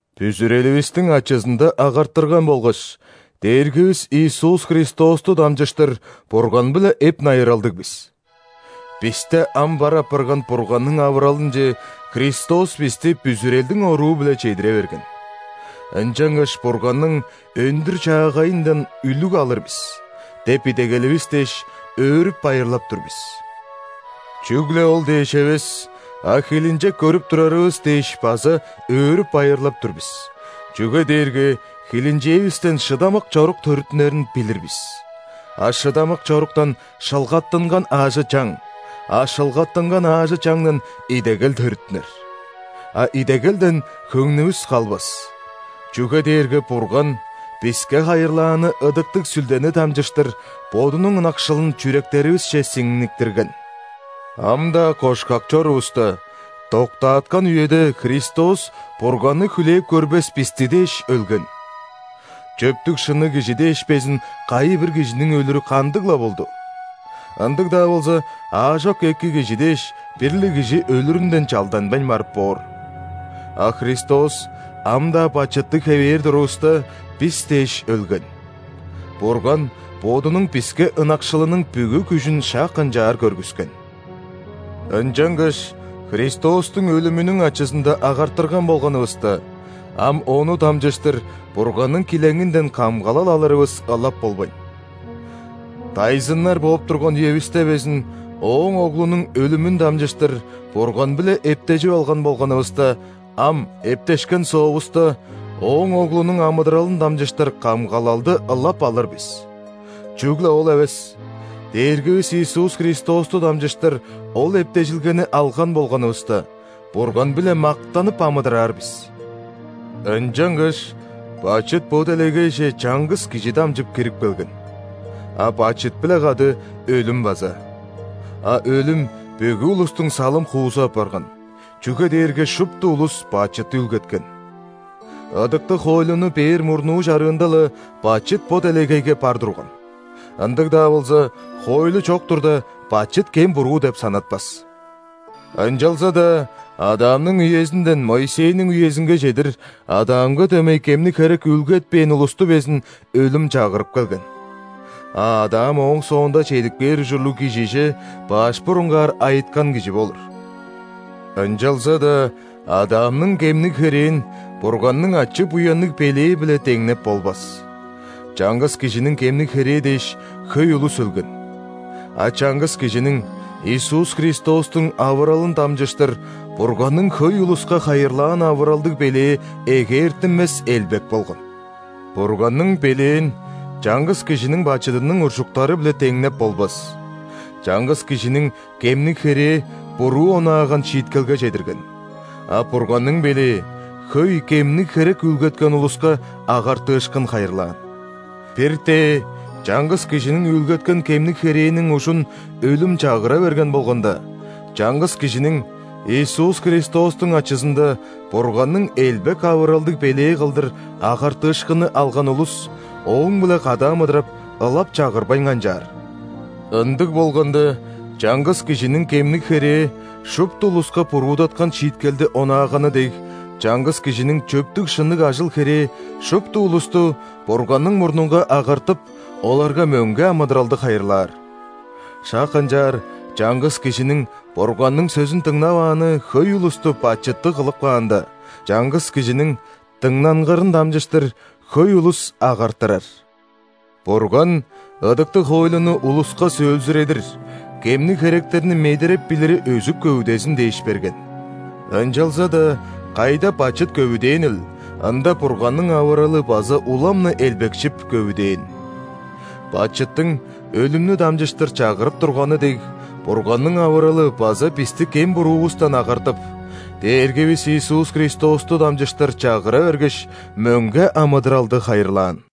Бүзүреливистиң ачызында агартырган болгаш, Дээргивис Иисус Христосту дамчыштыр Бурган-биле эп-найыралдыг бис. Бисте ам бар апарган Бурганның авыралынче Христос бисти бүзүрелдиң оруу-биле чедире берген. Ынчангаш Бурганның өндүр-чаагайындан үлүг алыр бис деп идегеливис дээш, өөрүп-байырлап тур бис. Чүгле ол дээш эвес, а хилинчек көрүп турарывыс дээш база өөрүп-байырлап тур бис, чүге дээрге хилинчээвистен шыдамык чорук төрүттүнерин билир бис. А шыдамык чоруктан – шылгаттынган аажы-чаң, а шылгаттынган аажы-чаңдан – идегел төрүттүнер. А идегелден хөңнүвүс калбас, чүге дээрге Бурган биске хайырлааны Ыдыктыг Сүлдени дамчыштыр Бодунуң ынакшылын чүректеривисче сиңниктирген. Ам-даа кошкак чорувуста, доктааткан үеде Христос Бурганны хүлээп көрбес бисти дээш өлген. Чөптүг-шынныг кижи дээш безин кайы-бир кижиниң өлүрү кандыг-ла болду (ындыг-даа болза, аажок эки кижи дээш, бир-ле кижи өлүрүнден чалданмайн барып боор). А Христос, ам-даа бачыттыг хевээр турувуста, бис дээш өлген. Бурган Бодунуң биске ынакшылының бүгү күжүн шак ынчаар көргүскен. Ынчангаш Христостуң өлүмүнүң ачызында агартырган болганывыста, ам Ону дамчыштыр Бурганның килеңинден камгалал алырывыс ылап болбайн. Дайзыннар бооп турган үевисте безин Ооң Оглунуң өлүмүн дамчыштыр Бурган-биле эптежип алган болганывыста, ам, эптешкен соовуста, Ооң Оглунуң амыдыралын дамчыштыр камгалалды ылап алыр бис. Чүгле ол эвес! Дээргивис Иисус Христосту дамчыштыр ол эптежилгени алган болганывыста, Бурган-биле мактанып амыдыраар бис. Ынчангаш бачыт бо делегейже чаңгыс кижи дамчып кирип келген, а бачыт-биле кады – өлүм база; а өлүм бүгү улустуң салым-хуузу апарган, чүге дээрге шупту улус бачыт үүлгеткен. Ыдыктыг хоойлуну бээр мурнуу чарыында-ла, бачыт бо делегейге бар турган. Ындыг-даа болза, хоойлу чок турда, бачыт кем-буруу деп санатпас. Ынчалза-даа Адамның үезинден Моисейниң үезинге чедир Адамга дөмей кемниг херек үүлгетпээн улусту безин өлүм чагырып келген. А Адам ооң соонда чедип кээр ужурлуг Кижиже баш бурунгаар айыткан кижи болур. Ынчалза-даа Адамның кемниг херээн Бурганның ачы-буянныг белээ-биле деңнеп болбас: чаңгыс кижиниң кемниг херээ дээш, хөй улус өлген. А чаңгыс Кижиниң – Иисус Христостуң авыралын дамчыштыр Бурганның хөй улуска хайырлаан авыралдыг белээ эгээртинмес элбек болган. Бурганның белээн чаңгыс кижиниң бачыдының уржуктары-биле деңнеп болбас: чаңгыс кижиниң кемниг херээ буруу онааган шииткелге чедирген, а Бурганның белээ – хөй кемниг херек үүлгеткен улуска агартыышкын хайырлаан. Бир-тээ чаңгыс кижиниң үүлгеткен кемниг херээниң ужун өлүм чагыра берген болганда, чаңгыс Кижиниң – Иисус Христостуң ачызында Бурганның элбек авыралдыг белээ кылдыр агартыышкынны алган улус Ооң-биле кады амыдырап, ылап чагырбайн канчаар! Ындыг болганда, чаңгыс кижиниң кемниг херээ шупту улуска буруудаткан шииткелди онааганы дег, чаңгыс Кижиниң чөптүг-шынныг ажыл-херээ шупту улусту Бурганның мурнунга агартып, оларга мөңге амыдыралды хайырлаар. Шак ынчаар чаңгыс кижиниң Бурганның сөзүн дыңнавааны хөй улусту бачыттыг кылып каанда, чаңгыс Кижиниң дыңнангырын дамчыштыр хөй улус агартырар. Бурган ыдыктыг хоойлуну улуска сөөлзүредир, кемниг херектерни медереп билири өзүп-көвүдезин дээш берген. Ынчалза-даа кайда бачыт көвүдээнил, ында Бурганның авыралы база улам-на элбекшип, көвүдээн. Бачыттың өлүмнү дамчыштыр чагырып турганы дег, Бурганның авыралы база бисти кем-буруувустан агартып, Дээргивис Иисус Христосту дамчыштыр чагыра бергеш, мөңге амыдыралды хайырлаан.